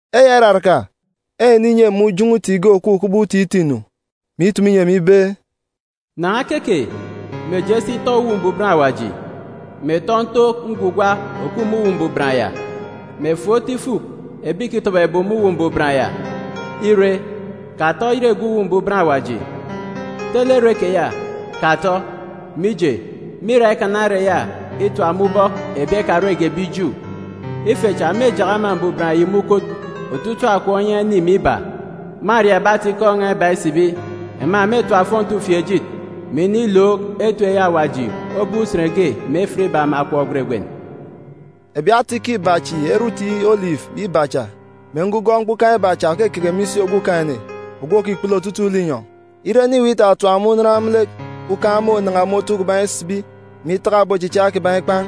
Eya iraraka, eneninyi emi ujọn̄ọ uti ge òkup kubọk uti itọ-inu, mè itumu inyi emi ibe, “Nan̄a keke, mè je si tọ Uwu Mbuban Awaji, mè tọ ntook ngwugwa òkup me Uwu Mbuban ya, mè fuk otu ifuk ebi ìkitọbọ ebum me Uwu Mbuban ya. Ire, katọ oyet egep Uwu Mbuban Awaji. Tele ere keya, katọ, mije, mîra ikana ere ya itap me ubọk ebi ekarege ebi Ju. Ife cha mêjak ama mbuban yi me ukot otuuk kè akọp onyan̄ ini mè iba. Mâria ebi ata-ikọ n̄a iba isibi. Ema mêtap ofọnti ufieejit, mè inilook etip eyi Awaji obop usen ge mè efit iba mè akọp gweregwen.” Ebi ata-ikọ iba chi ere uti olifu iba cha, mè ngugọọn̄ mkpukan̄ iba cha òkeke me isi Okumugwem ogwu òkikpulu otutuuk linyọn̄. Ire ene iweek itatap ema unan me lek, ukan̄ mônan̄a me otu kiban̄ isibi, mè itaka ebi ochicha kiban̄ ikpan̄.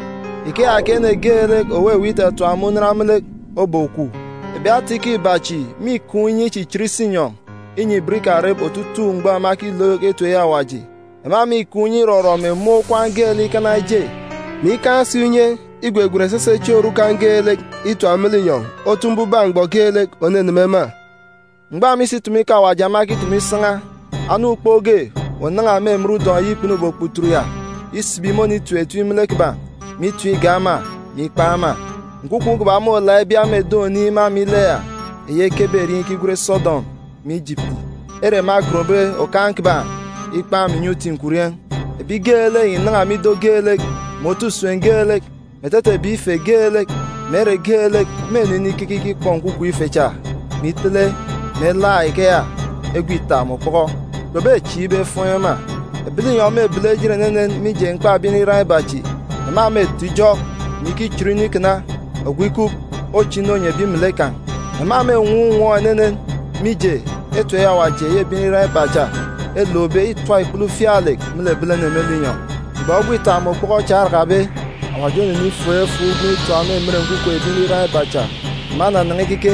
Ikeya ke ene geelek òweweek itatap ema unan me lek obokwu. Ebi ata-ikọ iba chi mîkaan̄ unye ichichit isinyọn̄, inyi ibot ikarep otutuuk mgbọ ema ekilook etip eyi Awaji. Ema mîkaan̄ unye irọrọ mè mun̄ okwaan̄ geelek ikana eje, mè ikaan̄ si unye igwegwen esese chieen̄ orukan̄ geelek itap me linyọn̄ otu ifuk mbubak mgbọ geelek òneneme ema. Mgbọ ema isi itumu ikọ Awaji ema ekitumu isan̄a, anam ukpook ge ònan̄a me emen udọn̄ kpunube okputut ya isibi mônitim etim me lek kiban̄, mè itim igak ema, mè ikpan̄ ema. Nkwukwu kiban̄ môlaak ibia me eden̄ oniin̄ me ama ile ya, eyi ekebe erieen̄ ikigwen Sodọm mè Ijipiti, ere ema egonbe Okaan̄ kiban̄ ikpan̄ me inyọn̄ uti nkwurieen̄. Ebi geelek ìnan̄a me ido geelek, mè otu usem geelek, mè etete ebi ife geelek, mè ere geelek mênu inikeke ikikpọ nkwukwu ife cha, mè itele mè elaak ikeya egwe ita mè okpọkọ. Kpebechieek ibe efuun̄ ema. Ebi linyọn̄ mêbele ejit enenen mije mkpa ebi nriran iba chi. Ema mêto ijọk, mè ikichon inu ikana, ogwu ikup, oche inu onyi ebi melek kan̄. Ema mênwọọn̄ unwọọn̄ enenen, mije, etip eyi Awaji eyi ebi nriran iba cha elookbe îtap ikpele ufialek me lek ebilene me linyọn̄. Mgbọ egwe ita mè okpọkọ cha orakabe, Awaji onenifuuk efuuk ugwem itap me emen nkwukwu ebi nriran iba cha. Ema enanan̄a ikeke,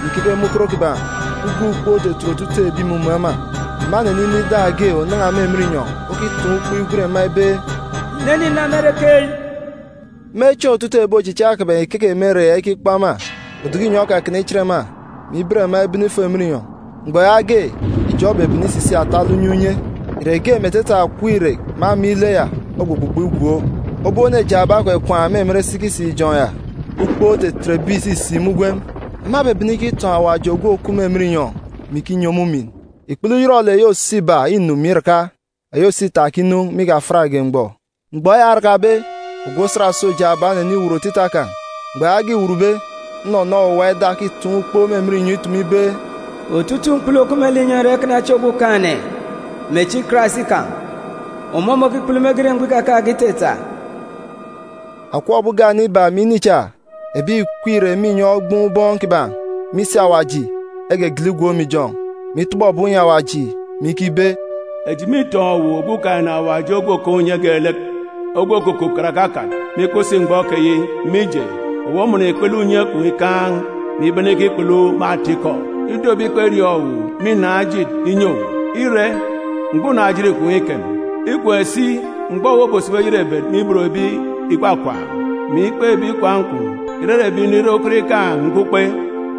mè ikeke me ukot kiban̄. Uga ukpook otetet otutuuk ebi ìmumun̄ ema. Ema eneninọ ida ge ònan̄a me emen inyọn̄ okitaan̄ ukpo igwen ema ibe, “Ìnene ìna me ere keyi.” Me chieen̄ otutuuk ebi ochicha kiban̄ ìkeke me ere ya ikikpọ ema, oduku inyọn̄ okakana ichit ema, mè iben ema ibene ifo emen inyọn̄. Mgbọ yaage, ijọn̄ obebene isisik atalek unye unye. Irek ge me etete akọp irek me ama ile ya ogbugbugbọ igwook. Obop ene jaaba ekwakwaan̄ me emen sikisik-ijọn̄ ya. Ukpook otetet ebi ìsisik me ugwem. Ema ebebene ikitọn̄ Awaji òkup me inyọn̄, mè ikinyi ọmọ umin. Ikpele uyọrọlek eyi òso iba înu mè iraka. Eyi òso ita òkinu me ikafiatge mgbọ. Mgbọ eya orakabe, ogwu osat òso jaaba oneniwut otita kan̄. Mgbọ yaage îwutbe, nnọnọ owuwa ida okitaan̄ ukpo me emen inyọn̄ itumu ibe, “Otutuuk mkpulu òkup me linyọn̄ îra ikana echi Okumugwem mè echi Karais kan̄. Ọmọ môkikpulu mege ire mgbọ ikakaan̄ge itata.” Akọp ebi ugane iba mè ini cha, ebi ìkweek irek me inyọn̄ ogboon̄ ubọọn̄ kiban̄ me isi Awaji, egegele igwook me ijọn̄, mè itọbọ ebum inyi Awaji, mè ikibe, “Eji mîtọn̄ owu Okumugwem Awaji Ogwu Òkaan̄ Unye Geelek, ogwu òkukup karake akat, mè ikup si mgbọ keyi, mije, owu omọnọ ikpele unye kwun̄ ikaan̄, mè ibene ikikpulu me atikọ. Ido ebi kperiọọn̄ owu mînaan̄ ejit inyi owu, ire, mgbọ unaan̄-ejit kwun̄ îkem. Îkem si mgbọ owu obosibi oyerebet me ibot ebi ìkwakwaan̄, mè ikpe ebi ikwaan̄ kwun̄, ìrere ebi nriran ukot ikaan̄ mkpukpe,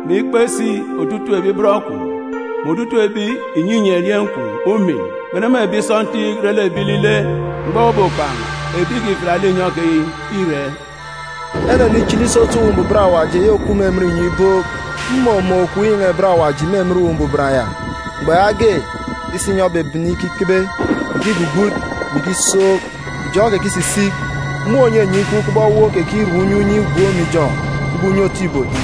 mè ikpe si otutuuk ebi bọn kwun̄, mè otutuuk ebi ìnyinyi erieen̄ kwun̄ umin, bene me ebi sọntiik re lek ebi ilile. Mgbọ owu obokpan̄ ebi ìkifiat linyọn̄ keyi îre.” Enenichili isotu Uwu Mbuban Awaji eyi òkup me emen inyọn̄ ibook. Mmumun̄ okop inyan̄a-ibot Awaji me emen Uwu Mbuban ya. Mgbọ yaage, isinyọn̄ obebene ikikebe, mè ikigbugbut, mè ikisook. Ijọn̄ okekisisik, mun̄ ònyenye ikup kubọk ewuuk okekirep unye unye igwook me ijọn̄ kubọk unye otu ibot.